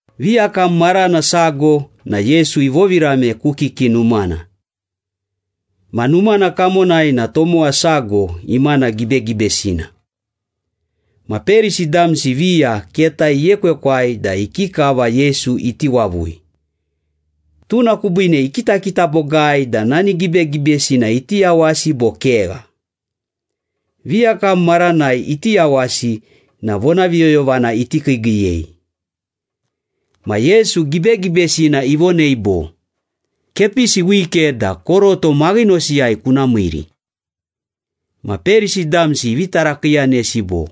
Viyakam marana sago na Yesu ivovirame ku kiki numana. Ma numana kamonai na tomowa sago imana gibegibesina. Ma Perisi damsi viya keta iekwekwai da ikikava Yesu iti wavui. Tuna kubiine ikitakita bogai da nani gibegibesina iti yawasi bo kegha. Viyakam maranai iti yawasi na vonaviyoyovana iti kiigiiyei. Ma Yesu gibegibesina ivonei bo, “Kepisi wike da koroto maghinosiyai kuna miiri.” Ma Perisi damsi ivi tarakiiyanesi bo,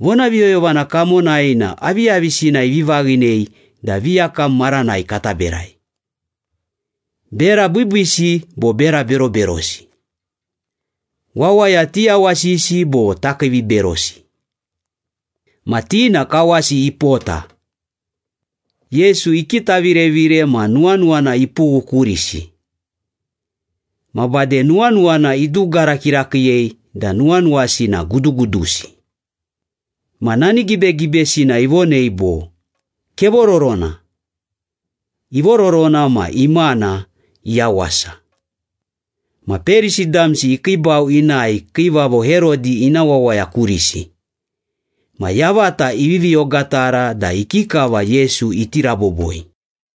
“Vonaviyoyovana kamonai na aviyavisina ivi vaghinei da viyakam maranai kata berai? Bera biibiisi bo bera beroberosi? Wawaya tiyawasisi bo takiiviberosi?” Ma ti na kawasi ipota. Yesu ikitavirevire ma nuwanuwana ipughu kurisi. Ma bade nuwanuwana idugara kirakiiyei da nuwanuwasi na gudugudusi. Ma nani gibegibesina ivonei bo, “Kevororona.” Ivororona ma imana iyawasa. Ma Perisi damsi ikiibau inae Kiivavo Herodi ina wawaya kurisi. Ma yavata ivivi ogatara da ikikava Yesu iti raboboi.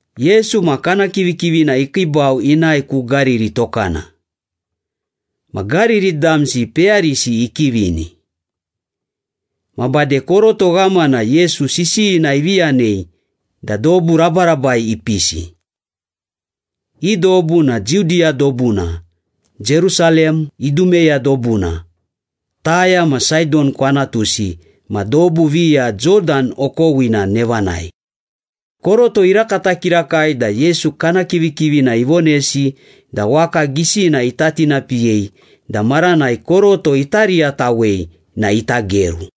Yesu ma kana kivikivina ikiibau inae ku Gariri Tokana. Ma Gariri damsi peyarisi ikivini. Ma bade koroto ghamana Yesu sisiyina ivi yanei da dobu rabarabai ipisi. I dobu na Judiya dobuna, Jerusalem, Idumeya dobuna, Taya ma Saidon kwanatusi ma dobu viya Jodan okowina nevanai. Koroto irakata kirakai da Yesu kana kivikivina ivonesi da waka gisina ita tinapiyei da maranai koroto ita riyatawei na ita geru.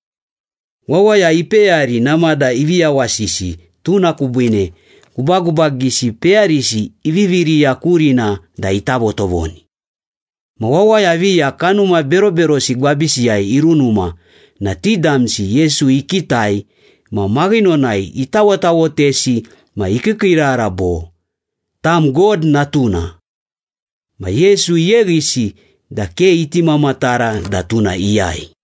Wawaya ipeyari namada ivi yawasisi tuna kubiine gubagubagisi peyarisi ivivi riya kurina da ita votovoni. Ma wawaya viya kanuma beroberosi gwabisiyai irunuma na ti damsi Yesu ikitai ma maghinonai itawotawotesi ma ikiikiirara bo, “Tam God Natuna!” Ma Yesu iyeghisi da ke iti mamatara da tuna iyai.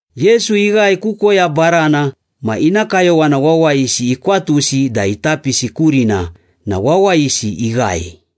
Yesu ighae ku koya barana ma ina kayowana wawayisi ikwatusi da ita pisi kurina na wawayisi ighae.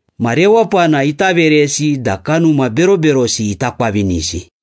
ma rewapana ita veresi da kanuma beroberosi ita kwavinisi.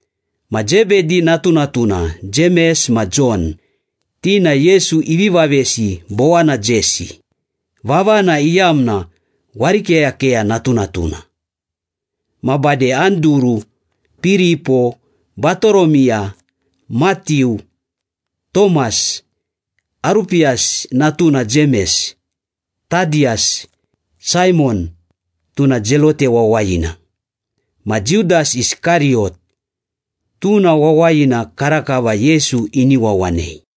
ma Zebedi natunatuna Jemes ma Jon, ti na Yesu ivi vavesi Bowanajesi, vavana iyamna warikeyakeya natunatuna. Ma bade Anduru, Piripo, Batoromiya, Matiu, Tomas, Arupiyasi natuna Jemes, Tadiyas, Saimon, tuna Zelote wawayina, ma Judas Iskariyot, tuna wawayina karakava Yesu ini wawanei.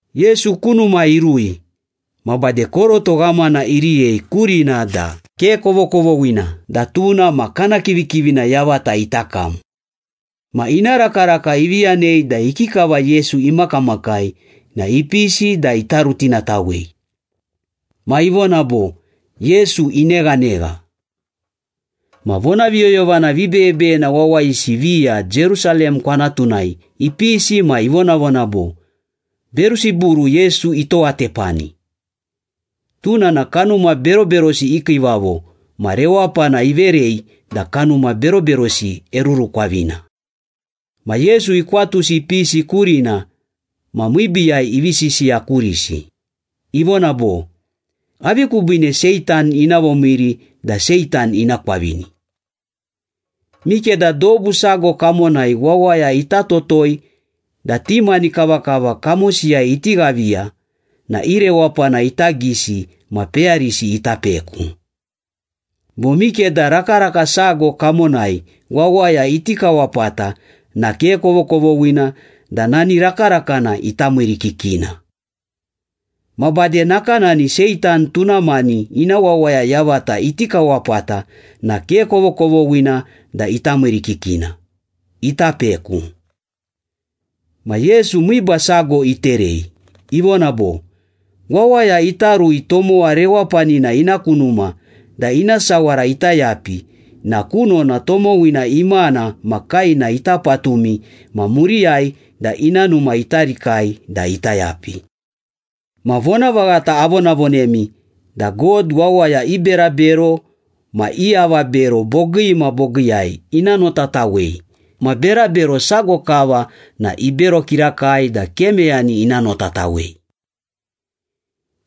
Yesu ku numa irui, ma bade koroto ghamana iriyei kurina da ke kovokovoghina da tuna ma kana kivikivina yavata ita kam. Ma ina rakaraka ivi yanei da ikikava Yesu imakamakai na ipisi da ita rutinatawei. Ma ivona bo, “Yesu ineghanegha.” Ma vonaviyoyovana vibeyebeyena wawayisi viya Jerusalem kwanatunai ipisi ma ivonavona bo, “Berusiburu Yesu itowatepani. Tuna na kanuma beroberosi i kiivavo ma rewapana iverei da kanuma beroberosi erurukwavina.” Ma Yesu ikwatusi ipisi kurina ma miibiiyai ivi sisiya kurisi, ivona bo, “Avi kubiine Seitan ina vomiiri da Seitan ina kwavini? Mikeda dobu sago kamonai wawaya ita totoi da ti mani kavakava kamosiyai iti ghaviya na i rewapana ita gisi ma peyarisi ita peku. Bo mikeda rakaraka sago kamonai wawaya iti kawapata na ke kovokovoghina da nani rakarakana ita miirikikina. Ma bade nakanani Seitan tuna mani ina wawaya yavata iti kawapata na ke kovokovoghina da ita miirikikina, ita peku.” Ma Yesu miiba sago iterei, ivona bo, “Wawaya ita rui tomowa rewapanina ina ku numa da ina sawara ita yapi na kunona tomowina imana ma kaena ita patumi ma muriyai da ina numa ita rikai da ita yapi.” “Ma vonavaghata avonavonemi da God wawaya i berabero ma i avabero bogii ma bogiiyai ina notatawei ma berabero sago kava na ibero kirakai da ke meyani ina notatawei.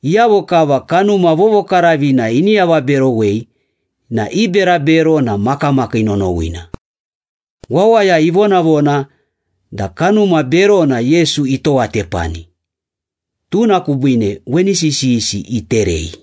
Iyavo kava Kanuma Vovokaravina ini avaberowei na i berabero na makamakii nonowina.” Wawaya ivonavona da kanuma berona Yesu itowatepani, tuna kubiine weni sisiyisi iterei.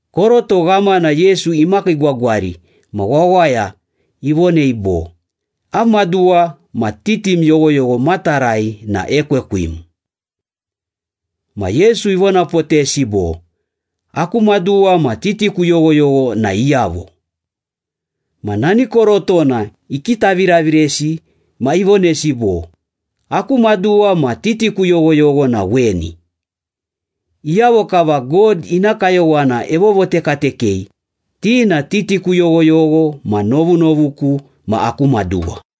Koroto ghamana Yesu imakiigwagwari ma wawaya ivonei bo, “Am maduwa ma titim yoghoyogho matarai na ekwekwim.” Ma Yesu ivonapotesi bo, “Aku maduwa ma titiku yoghoyogho na iyavo?” Ma nani korotona ikitaviraviresi ma ivonesi bo, “Aku maduwa ma titiku yoghoyogho na weni. Iyavo kava God ina kayowana evovotekatekei, ti na titiku yoghoyogho ma novunovuku ma aku maduwa.”